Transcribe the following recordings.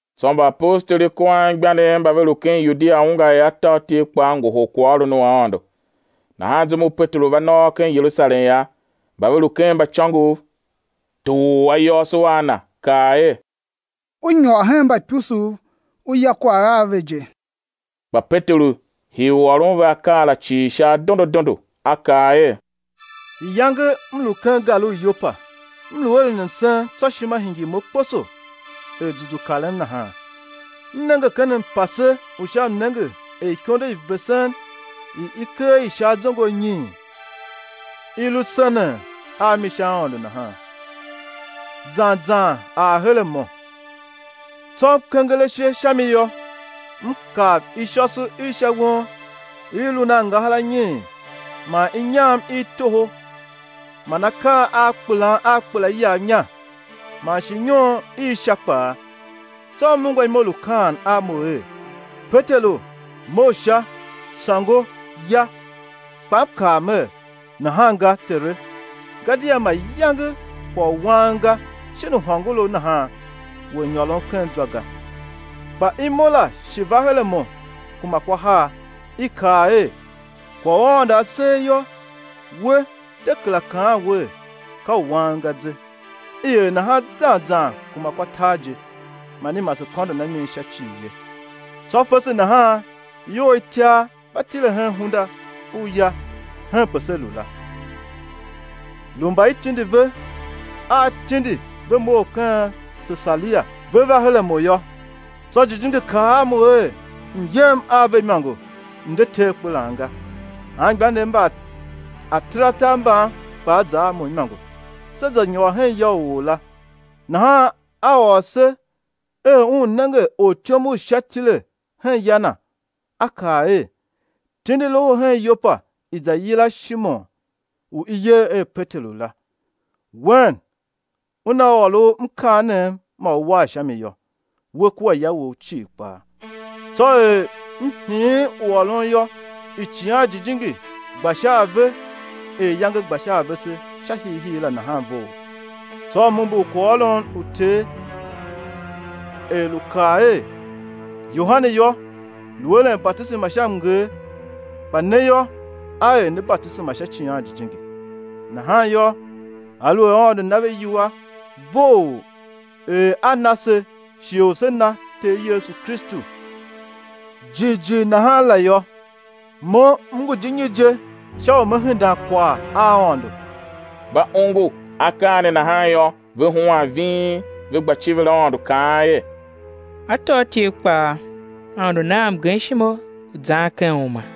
Tsô mbaapostoli kua anmgbianev mba ve lu ken Yudia ungwa er atôatyev kpaa ngohol kwaghôron u Aôndo. Nahan zum u Peteru va nôôr ken Yerusalem yô, mba ve lu ken mbaicôngov toor ayôôso a na, kaa er: U nyôr hen mbaipusuv u ya kwagh a ve je. Kpa Peteru hii u ôron ve akaa la cii sha adondo adondo, a kaa er: Iyange m lu ken gar u Yopa, m lu eren msen tsô ishima hingir mo kposo er zuzu karem nahan, m nenge ken mpase u sha mnenge er ikondo i vesen, i i ker i sha azongo anyiin, i lu senen a mi sha aôndo nahan, zan zan ar her a mo. Tsô m kenger ashe sha mi yô, m kav ishôso i sha won i lun a angahar anyiin, man inyam i toho man akaa a kpelan a kpela iyav inya, man shi inyon i sha kpaa. Tsô m ungwa imo lu kaan a mo er: Peteru, mough sha, sôngo, ya. Kpa m kaa mer: Nahan ga, Tere, gadia mayange kwagh u wang ga shin u hôngorough nahan ngu a nyôrom ken zwa ga. Kpa imo la shi va her a mo kuma kwa har, i kaa er: Kwagh u Aôndo A ser yô, we de kera kaan wer ka u wang ga ze. I er nahan zan zan kuma kwa tar je, man i mase kôndon a mi sha cii ye. Tsô fese nahan ior itiar va tile hen hunda u ya henpe se lu la, lu mba i tindi ve a tindi ve mough ken Sesaria ve va her a mo yô. Tsô Jijingi kaa a mo er m̱ yem a ve imôngo, m̱ de te akperan ga. Anmgbianev mba ataratar mban kpaa za a mo imôngo, se za nyôr hen ya u or la. Nahan a ôr se er un nenge ortyom u Sha tile hen ya na, a kaa er: Tindi loho hen Yopa, i̱ za yila Shimon u i yer er Peteru la, wen una ôr u mkaanem ma ú war sha mi yô, we kua ya wou cii kpaa. Tsô er m hiin u ôron yô, Icighan Jijingi gba sha a ve er iyange gba sha a vese sha hiihii la nahan vough. Tsô m umbur kwaghôron u Ter er lu kaa er: Yohane yô, lu eren batisema sha mnger, kpa ne yô, á er ne batisema sha Icighan Jijingi. Nahan yô, aluer Aôndo na ve iwua vough er A na se shighe u se na Ter Yesu Kristu jighjigh nahan la yô, mo m ngu di nyi je sha u me hendan kwagh a Aôndo? Mba ongo akaa ne nahan yô, ve huan ving, ve gba civir Aôndo kaan er: Atôatyev kpaa, Aôndo na a mgemshima u zan ken uma.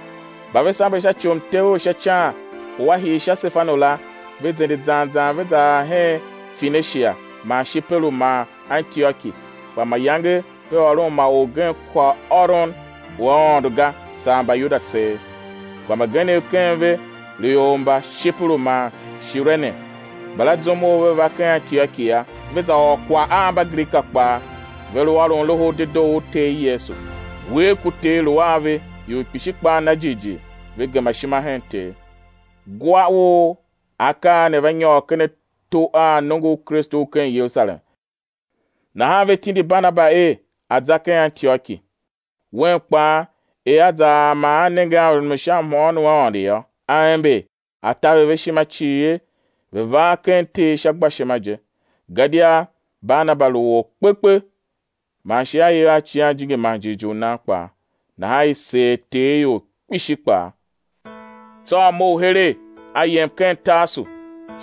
Mba ve sambe sha ci u mtev u sha ican u a hii sha Sefanu la, ve zende zan zan ve za ar hen Fenishia man Shiperu man Antioki, kpa mayange ve ôron ma orgen kwaghôron u Aôndo ga, saa Mbayuda tseegh. Kpa mbagenev ken ve lu ior mba Shiperu man Shirene; mbala zum u ve va ken Antioki yô, ve za ôr kwagh a Mbagrika kpaa; ve lu ôron Loho u Dedoo u Ter Yesu. Uwegh ku Ter lu a ve, ior kpishi kpaa na jighjigh ve gema ishima hen Ter. Ugwa u akaa ne va nyôr ken ato a nongo u Kristu u ken Yerusalem, nahan ve tindi Barnaba er a̱ za ken Antioki. Un kpaa, er a za ar man a nenge mrumun u sha mhôôn u Aôndo yô, a ember, a taver ve ishima cii er ve̱ var ken Ter sha gbashima je; gadia Barnaba lu or kpekpe, man shi a iv a Icighan Jijingi man jighjigh u nan kpaa. Nahan i seer Ter ior kpishi kpaa. Tsô a mough keregh, a yem ken Tarsu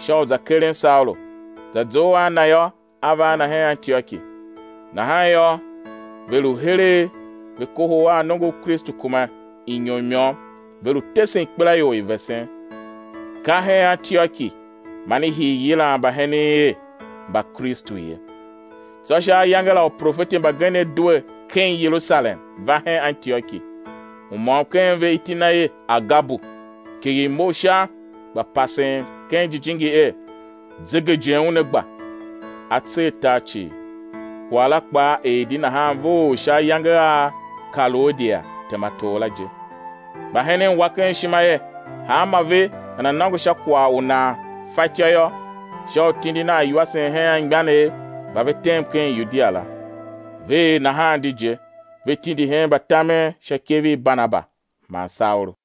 sha u za keren Saulu; za zough a na yô, a va a na hen Antioki. Nahan yô, ve lu heregh ve kohol a nongo u Kristu kuma inyom i môm, ve lu tesen ikpelaior i vesen. Ka hen Antioki man i hii yilan mbahenen er Mbakristu ye. Tsô sha ayange la uprofeti mbagenev due ken Yerusalem, va hen Antioki. U môm ken ve iti na er Agabu, kighir mough sha, gba pasen ken Jijingi er, zegejen una gba, á tser tar cii. Kwagh la kpaa er di nahan vough sha ayange a Kaloudia tema tor la je. Mbahenen wa ken ishima er hanmô ve nana nôngo sha kwagh u nan fatyô yô, sha u tindin a iwasen hen anmgbianev mba ve tem ken Yudia la. Ve er nahan di je; ve tindi hen mbatamen sha ikev i Barnaba man Saulu.